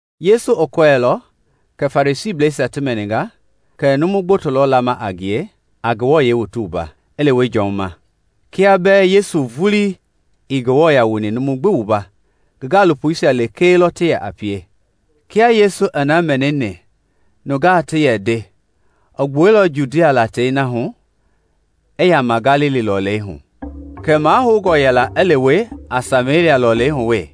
Yesu i kɔɛilɔ kɛ Farisiisia ti mɛninga kɛ numu gboto lɔ lama a ngie, a ti wua, i lewe Jɔn ma. (Kia bɛɛ Yesu vulii ii numu wuani, ngi gaalopoisia lekee lɔ ti yɛ pie.) Kia Yesu i na mɛnini nungaa ti yɛ nde i gbuɛilɔ Judia latei na hu i yama Galili lɔlei hu, kɛɛ mahoungnɔ yɛla i lewe a Samelia lɔlei hu wee.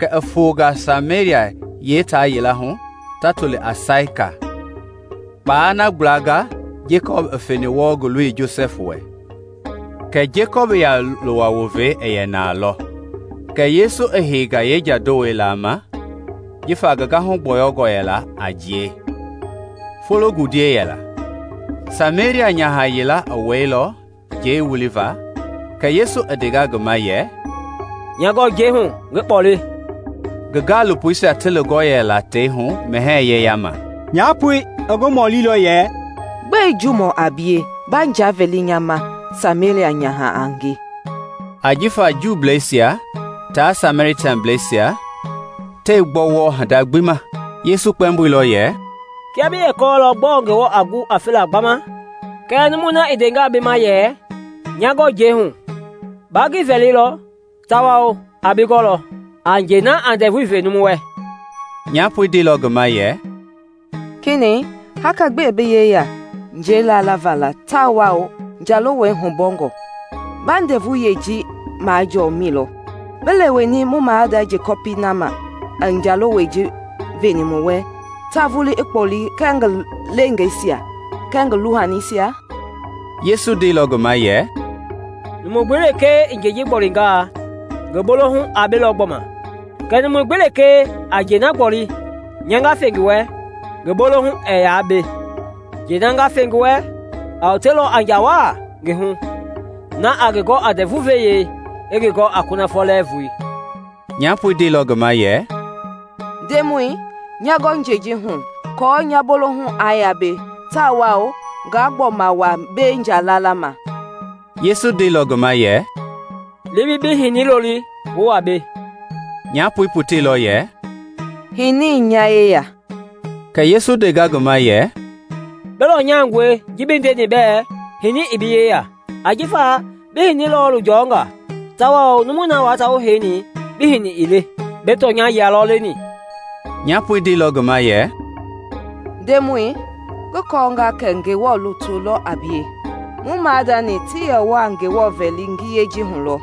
Kɛ i fonga Samelia yeetaa yila hu ta toli a Saika, kpaa na gbla Jekɔpi i feni wɔɔ ngi loi Josɛfi wɛ. Jekɔpi ya-lowa wovei i yɛ na lɔ kɛ Yesu i heinga yeenja-lowɛi laa, ngi gahu gbɔyɔngɔ waa a jiɛi. Fologundiei yɛla. Samelia nyaha yila i wɛilɔ njɛi wuliva kɛ Yesu i ndenga ngi ma yɛ, “Nya gɔ njɛi hu ngi kpɔle.” (Ngi gaalopoisia ti lingɔ yɛla tei hu mɛhɛɛ yeyama.) Nyapoi i ngi mɔlilɔ yɛ, “Gbɛe Juumɔ a bie, ba nja vɛli nya ma, Samelia nyaha a nge?” (Ajifa Juuisia tia Sameliablɛisia tɛɛ gbɔ wɔɔ hinda gbi ma.) Yesu i kpɛmboilɔ yɛ, “Kiaa bi yɛ kɔɔlɔ gbɔɔ Ngewɔ a gu a fela gbama kɛɛ numui na i ndenga bi ma yɛ ‘nya gɔ njɛi hu,’ baa ngi vɛlilɔ tawao aa bi gɔlɔ a njɛi na a ndɛvui ve numu wɛ.” Nyapoi ndeilɔ ngi ma yɛ, “Kenɛi, haka gbi ii bi yeya njɛi lalavaa la tawao njalowɛi hubɔngɔ; ba ndɛvu-ve yɛi ji majɔɔ mi lɔ? Bi leweni mu maada Jekɔpi na ma i njalowɛi ji veni mu wɛ, ta vulii i kpɔle kɛɛ ngi leengeisia kɛɛ ngi lohanisia?” Yesu ndeilɔ ngi ma yɛ, “Numu gbi lekee i njɛi ji gbolingaa ngi bolohu a belɔ gbɔma, kɛɛ numu gbi lekee a njɛi na gboli nya nga fe ngi wɛ, ngi bolohu ɛɛ yaa be; njɛi na nga fe ngi wɛ a wotelɔ a nja waa ngi hu na a ngi gɔ a ndɛvu-ve yɛi, i ngi gɔ a kunafɔ lɛɛvui.” Nyapoi ndeilɔ ngi ma yɛ, “Ndemɔi, nya gɔ njɛi ji hu aako nya bolohu aa yaa be tawao ngaa gbɔma wa mbei nja lalama.” Yesu ndeilɔ ngi ma yɛ, “Li bi bi hinii loli wu wa mbei.” Nyapoi poteilɔ yɛ, “Hini ii nya yeya.” Kɛ Yesu ndenga ngi ma yɛ, “Bi lɔnyangɔe ji bi ndeni bɛɛ hini ii bi yeya; ajifa bi hini lɔɔlu jɔnga tawao numui na wua ta wu heini kiahuna bi hini ii le; bi tɔnya-yia lɔ leni.” Nyapoi ndeilɔ ngi ma yɛ, “Ndemɔi, ngi kɔɔnga kɛ Ngewɔ lutu lɔ a bie. Mu maadani ti yɛ wɔɔ Ngewɔ vɛli ngiyei ji hu lɔ;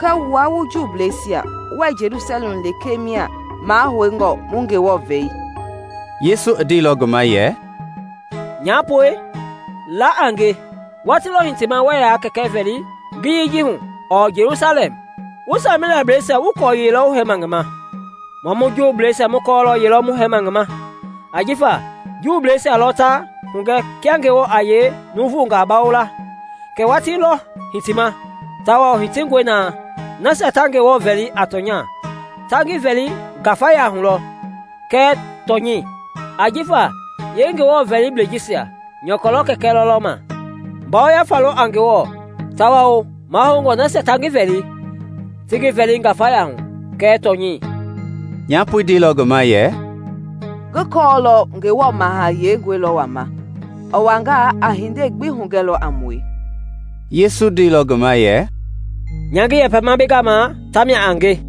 kɛɛ wua wu Juuisia wɛɛ Jelusalɛm lekee mia mahoungɔ mu Ngewɔ vɛ.” Yesu i ndeilɔ ngi ma yɛ, “Nyapoi, la a nge, watii lɔ hitima wɛɛ yaa Kɛkɛi vɛli ngiyei ji hu ɔɔ Jelusalɛm. Wu Sameliablɛisia wuii kɔɔ yelɔ wu hɛɛma ngi ma, mua mu Juuisia mu kɔɔlɔ ye lɔ mu hɛɛma ngi ma, ajifa Juuisia lɔ ta hugɛ kia Ngewɔ a yee nuuvungaa bawo la. Kɛɛ watii lɔ hitima, tawao hitingɔe na, nasia ta Ngewɔ vɛli a tɔnya ta ngi vɛli ngafaya hu lɔ kɛɛ tɔnyɛi, ajifa yeeNgewɔ vɛliblei jisia nyɔkɔ lɔ kɛkɛ lɔlɔma. Ngafa lɔ a Ngewɔ tawao mahoungɔ nasia ta ngi vɛli ti ngi vɛli ngafaya hu kɛɛ tɔnyɛi.” Nyapoi ndeilɔ ngi ma yɛ, “Ngi kɔɔlɔ Ngewɔ Maha Heingɔi lɔ wama; i wangaa, a hindei gbi hugɛlɔ a mue.” Yesu ndeilɔ ngi ma yɛ, “Nya ngi yɛpɛma bi gama, tamia a nge.”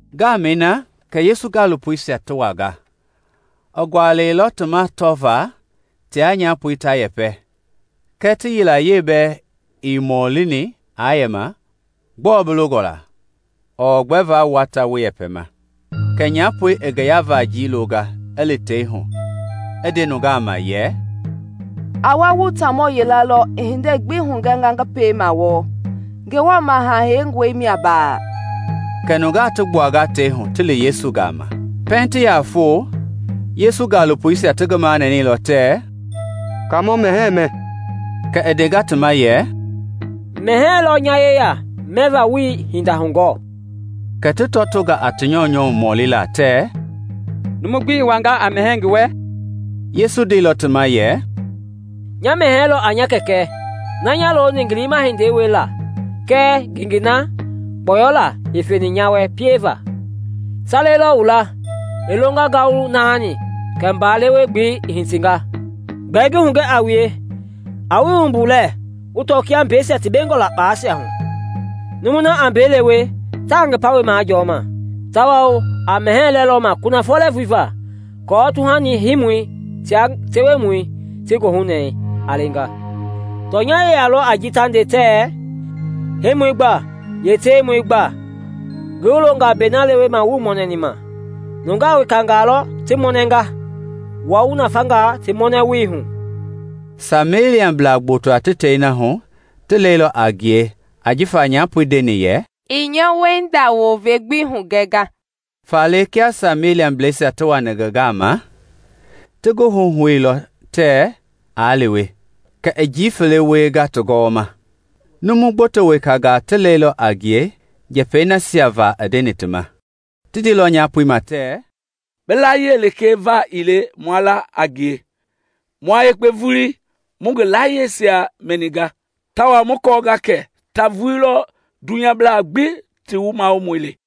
Ngamɛi na kɛ Yesu gaalopoisia ti wanga. I gualɛilɔ ti ma tɔva tia nyaha ta yɛpɛ, kɛɛ ti yilayee bɛɛ ii mɔlini aa yɛma, “Gbɔɔ bi longɔ la?” ɔɔ “Gbɛe wua ta wu yɛpɛma?” Kɛ nyapoi i ngi ya-vajii longa, i li tei hu, i nde nungaa ma yɛ, “A wa wu taamɔ yila lɔ i hindei gbi hugɛnga ngi piema wɔɔ. Ngewɔ Maha Heingɔi mia baaa?” Kɛ nungaa ti gbuanga tei hu, ti li Yesu gama. Pɛiŋ ti yaa foo, Yesu gaalopoisia ti ngi manɛnɛilɔ tɛɛ, “Kaamɔ, mɛhɛɛ mɛ.” Kɛɛ i ndeilɔ ti ma yɛ, “Mɛhɛɛ lɔ nya yeya mɛva wuii hinda hugɔɔ.” Kɛ ti tɔtonga a ti nyɔunyɔ mɔlila tɛɛ, “Numu gbi i wanga a mɛhɛɛ ngi wɛ?” Yesu ndeilɔ ti ma yɛ, “Nya mɛhɛɛi lɔ a nya Kɛkɛ na nya loni ngi liima hindei wiela kɛɛ ngengei na gbɔyɔlaa i feni nya wɛ pieva. Sale lɔ wu laa, ‘I longa ngalu naani kɛ mba lewe-gbelei i hitinga.’ Gbɛɛ ngi hugɛ a wue, a wu wui wumbu lɛɛ wu tɔ kia mbeisia ti bengɔ la kpalɛisia hu. Numui na a mbei lewe taa ngi pawɛi majɔma, tawao a mɛhɛɛ lɛ lɔ ma kunafɔ lɛɛvui va, aako tuhani hiimɔi tia tewemɔi ti goohunɛɛ a leenga. Tɔnya-yia lɔ a ji ta nde tɛ. ‘Hiimɔi gba yee tewemɔi gbaa.’ Ngi wu longa mbei na leweva wuii mɔnɛi ma; nungaa wekangaa lɔ ti mɔnɛnga, wua wu nafanga ti mɔnɛwoi hu.” Sameliablaa gboto tei na hu ti lɛilɔ a ngie ajifa nyapoi i ndeni yɛ, “I nya wiehinda wovei gbi hugɛnga.” Faale kia Sameliablɛisia ti wani ngi gama, ti ngi huhouilɔ tɛɛ aa lewe, kɛ i njii fele wienga ti gɔwɔma. Numu gboto wekangaa ti lɛilɔ a ngie njɛpɛi nasia va i yɛ nde ti ma. Ti ndeilɔ nyapoi ma tɛɛ, “Bi layie lekee va ii le maa la a ngie; mua yekpe vulii mu ngi layiesia mɛninga tawao mu kɔɔnga kɛ ta vulii lɔ dunyablaa gbi ti wumawomɔi le.”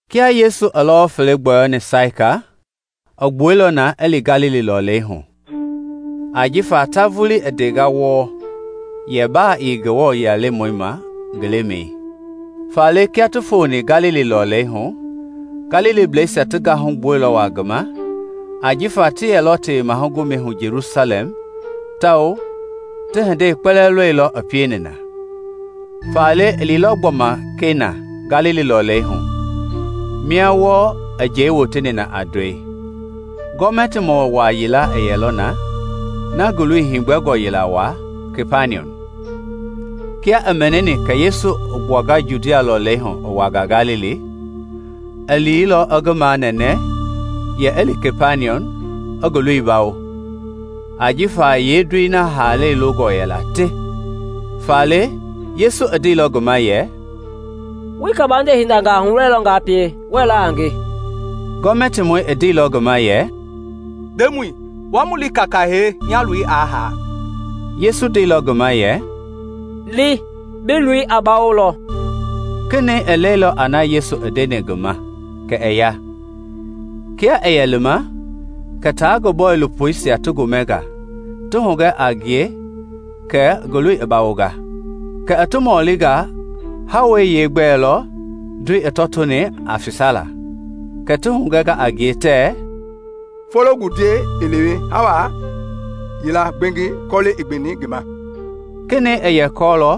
Kia Yesu i lɔwɔ fele gbɔyɔni Saika, i gbuɛilɔ na i li Galili lɔlei hu, ajifa ta vulii i ndenga wɔɔ yɛ baa ii Ngewɔ lutu ma ngi lemɛi. Faale kia i foni Galili lɔlei hu, Galiliblɛisia ti gahu gbuɛilɔ waa ngi ma ajifa ti yɛlɔ Tewema Gomɛi hu Jelusalɛm tawao ti hindei kpɛlɛɛ lɔilɔ i pieni na. Faale i liilɔ gbɔma Kena, Galili lɔlei hu, mia wɔɔ i njɛi woteni na a ndɔi. Gɔmɛtimɔ waa yila i yɛlɔ na, ngi hindoloi heegbɛngɔ waa Kapaniɔm. Kia i mɛnini kɛ Yesu i gbuanga Judia lɔlei hu i wanga Galili, i liilɔ i ngi manɛnɛ yɛ i li Kapaniɔm i ngi loi bawo, ajifa yeendoi haala longɔ yɛla te. Faale Yesu i ndeilɔ ngi ma yɛ, “Wuii kabande hindangaa hulɔilɔ nga pie, wuɛɛ la a nge.” Gɔmɛtimɔi i ndeilɔ ngi ma yɛ, “Ndemɔi, wa mu li kaaka hee, nya loi aa haa.” Yesu ndeilɔ ngi ma yɛ, “Li; bi loi a bawolɔ.” Kenɛi i lɛilɔ a na Yesu ndeni ngi ma kɛ i ya. Kia i yɛ lima kɛ tia ngi bɔilopoisia ti gomɛnga, ti hugɛ a ngie kɛ ngi loi i bawonga. Kɛ i ti mɔlinga hawei yeegbɛ ma lɔ ndoi i tɔtoni a fesala, kɛ ti hugɛnga a ngie tɛɛ, “Fologundiei i leweni hawa yila gbengi kɔle i gbeni ngi ma.” Kenɛi i yɛ kɔɔlɔ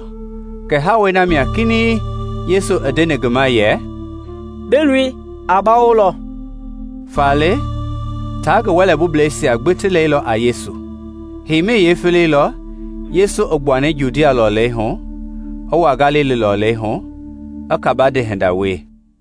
kɛ hawei na ma mia kinɛiŋ Yesu i ndeni ngi ma yɛ, “Bi loi a bawolɔ.” Faale tia ngi wɛlɛ bublɛisia gbi ti lɛilɔ a Yesu. Heima yeefele lɔ Yesu i gbuani Judia lɔlei hu i wa Galili lɔlei hu i kabande hinda wie.